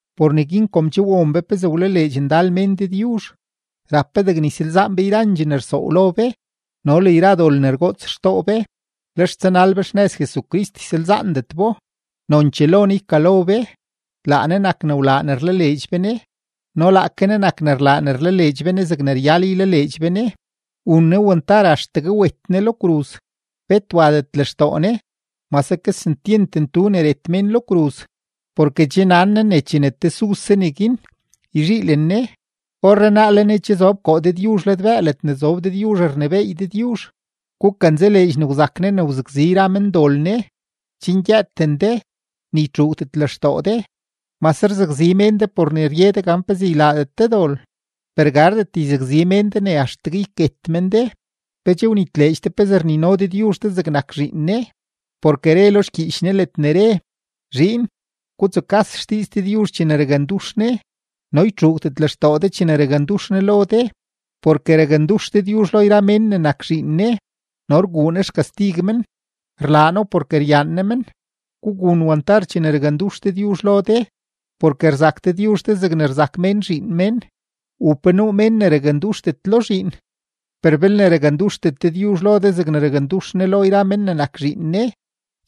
Por neguin kom che won be pezee wlaleedx ndal mén Dëdyuzh, rap be degne ysalzaan be yrandxee ne rsoow lo be no le yra dol ne rgoots xtoo be, lex tsanal be xnëz Jesucrist, ysalzaandet bo. Nonchee lo Ne ykalo be, laa Ne nak ne wlaa ne rlaleedx be Ne no laake Ne nak ne rlaa ne rlaleedx be Ne zegne ryal ylaleedx be Ne. Wun Ne wantar axtegue wet Ne lo kruz, bet wadet lextoo Ne, mase kesentyent ntu ne ret mén lo kruz, porke che nan Ne ne chene tesuse neguin, yzhiilen Ne. Orrenaa le Ne che zob koo Dëdyuzh ladbëë ledne zob Dëdyuzh rnebééy Dëdyuzh. Gukanzaleedx ne wzak Ne ne wzakzi yra mendol Ne, chen gyëëten de, ni ytxuugdet lextoo de. Mase rzakzi mén de por ne rye de gan pezee ylaadet de dol, per gardet yzakzi mén de ne axtegue yket men de. ¿Pe che wnitleedx de pezee rnino Dëdyuzh de zegnak zhiin Ne? Porke re lo xgyiich Ne ledne re: Zhiin, gutsukas xdiiz Dëdyuzh chene rakndux Ne no ytxuugdet lextoo de chene rakndux Ne lo de. Porke rakndux Dëdyuzh lo yra mén ne nak zhiin Ne no rguu Ne xkastig men; rlaa No porke ryaan Ne men. Gugun wantar chene rakndux Dëdyuzh lo de, porke rzak Dëdyuzh de zegne rzak mén zhiin mén, u ¿pe nuu mén ne raknduxdet lo zhiin? Per belne raknduxdet Dëdyuzh lo de zegne rakndux Ne lo yra mén ne nak zhiin Ne,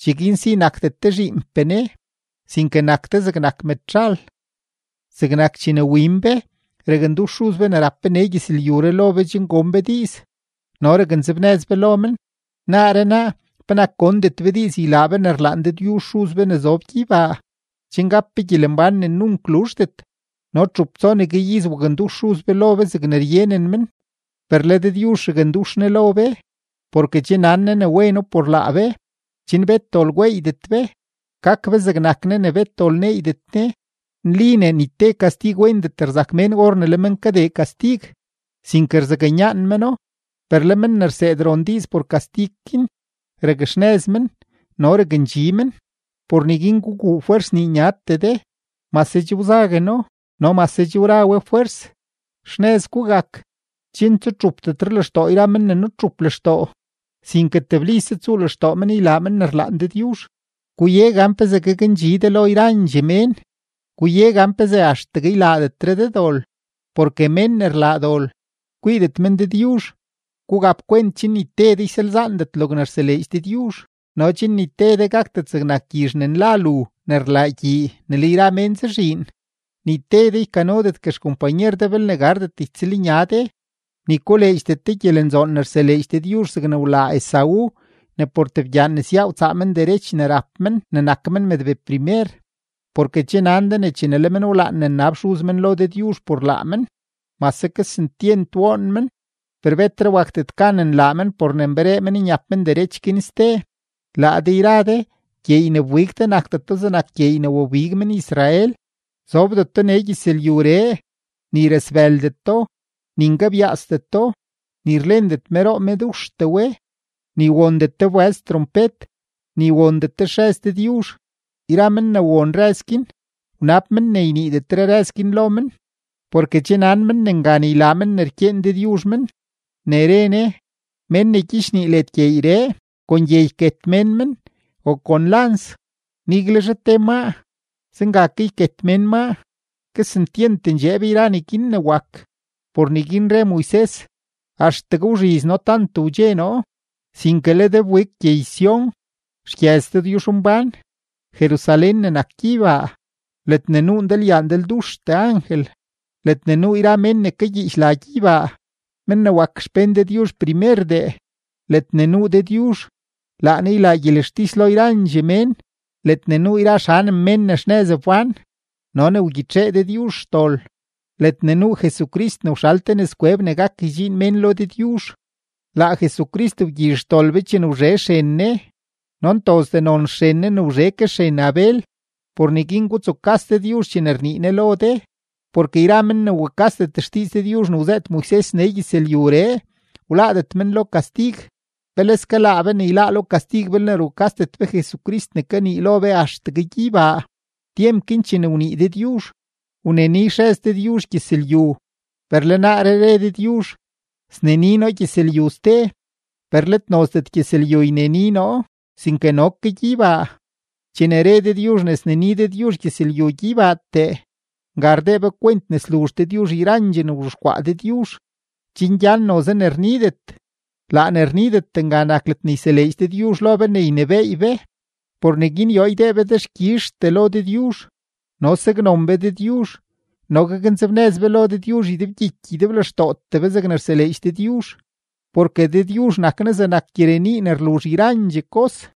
cheguin si nakdet de zhiinpee Ne, sinke nak de zegnak mëdzhal. Zegnak chene win be, rakndux xuz be ne rap be nee gyëzlyuree lo be chen gon be diiz no raknzebnëz be lo men. Naaree naa, ¿penak gondet be diiz ylaa be ne rlaan Dëdyuzh Xuz be ne zob gyeybaa, chen gap be gyelembán ne nunk luzhdet? No txup tsonegue iz wakndux xuz be lo be zegne ryenen men; per le Dëdyuzh rakndux Ne lo be, porke che nan Ne ne weno por laa be, chen bet dol gweeydet be, gak be zegnak Ne ne bet dol neeydet Ne. Nli ne ni te kastig wendet rzak mén or ne le men kadee kastig, sinke rzaknyaan meno, per le men ne rseed ron diiz por kastig guin, rakxnëz men no rakndxi men. Por neguin guguu fwers nii nyatee de, mase che wzagueno no mase che wra we fwers. Xnëz gugak, chen tsutxupdetre lextoo yra men ne nutxup lextoo, sinke teblise tsuu lextoo men ylaa men ne rlaan Dëdyuzh. Guye gan pezee gakndxi de lo yrandxee mén, guye gan pezee axtegue ylaadetre de dol, porke mén ne rlaa dol, kwiidet men Dëdyuzh. Gugap kwent chen ni te de ysalzaandet logne rseleedx Dëdyuzh no chen ni te de gakdet zegnak gyizh ne nla lu ne rlaa gyii ne le yra mén zazhiin. Ni te de ykanodetgue xkompanyer belne gardet ytsëlnya de, ni koleedxdet de gyelenzoon ne rseleedx Dëdyuzh zegne wlaa Esaú ne por tebgyaan nesyaa wtsaa men xderech men ne rap men ne nak men mëdbee primer. Porke che nan de ne chene le men wlaan ne nnab xuz men lo Dëdyuzh por laa men, mase kesentyent woon men, per betre wakdet gan nlaa men por ne nberee men nyap men derech guin ste. Laa de yra de, gyeey ne wbig de nakdeto zegnak gyeey ne wabig men-Israel; zobdeto nee gyëzlyuree, ni rasbëldeto, ni nkebyaasdeto, ni rlendet meroo meduxtee we; ni wondet de wbëz trompet, ni wondet de xrëz Dëdyuzh. Yra men ne won rëz guin, wnab men ne yniidetre rëz guin lo men, porke che nan men ne ngan ylaa men ne rkyeen Dëdyuzh men, ne re Ne: “Mén ne gyichnii led gyeeyree, kon gye yket mén men o kon lans, niguelzhe te maa, zenga ke yket mén maa.” Kesentyent ndxeeb yra neguin ne wak, por neguin re Moises: “Axtegue wzhiz noo tant wdxe noo.” Sinke le de wbig gyey-Sión, xgyëz Dëdyuzhmbán, Jerusalén ne nak gyeybaa, ledne nuu ndalyaa ndalduxtee angel, ledne nuu yra mén ne kagyiich la gyeybaa, men ne wak xpén Dëdyuzh primerdee, ledne nuu Dëdyuzh (Laa Ne ylaa gyelextis lo yrandxee mén.), ledne nuu yra xanem mén ne xnëz wbán no ne wgyitxee Dëdyuzh xdol, ledne nuu Jesucrist ne wxal te nëzkweb ne gak ydxiin mén lo Dëdyuzh, laa Jesucrist wgyizh xdol be chene wzhe xren Ne no ntozdee non xren Ne ne wzhe ke xren Abel. Por neguin gutsukas Dëdyuzh chene rnii Ne lo de, porke yra men ne wukasdet xdiiz Dëdyuzh ne wzëët Moises nee gyëzlyuree, wláádet men lo kastig. ¡Peleske laa be ne yláá lo kastig belne rukasdet be Jesucrist ne kanii lo be axtegue gyeybaa! Tyemp guin chene wnii Dëdyuzh wneni xrëz Dëdyuzh gyëzlyu, per le naaree re Dëdyuzh: “Sneni noo gyëzlyu ste, per let nozdet gyëzlyu yneni noo, sinke no ke gyeybaa.” Chene re Dëdyuzh ne sneni Dëdyuzh gyëzlyu gyeybaatee, nga rdee be kwent ne sluzh Dëdyuzh yrandxee ne wzhexkwaa Dëdyuzh, chen gyan noze ne rnidet. Laa ne rnidet nga nak ledne yseleedx Dëdyuzh lo be ne ynebééy be. Por neguin yoo ydee be dexkyizhtee lo Dëdyuzh no saknon be Dëdyuzh no gaknzebnëz be lo Dëdyuzh ydebgyiky ydeblextootee be zegne rtseleedx Dëdyuzh, porke Dëdyuzh nak Ne zegnak gyirenii ne rluzh yrandxee kos.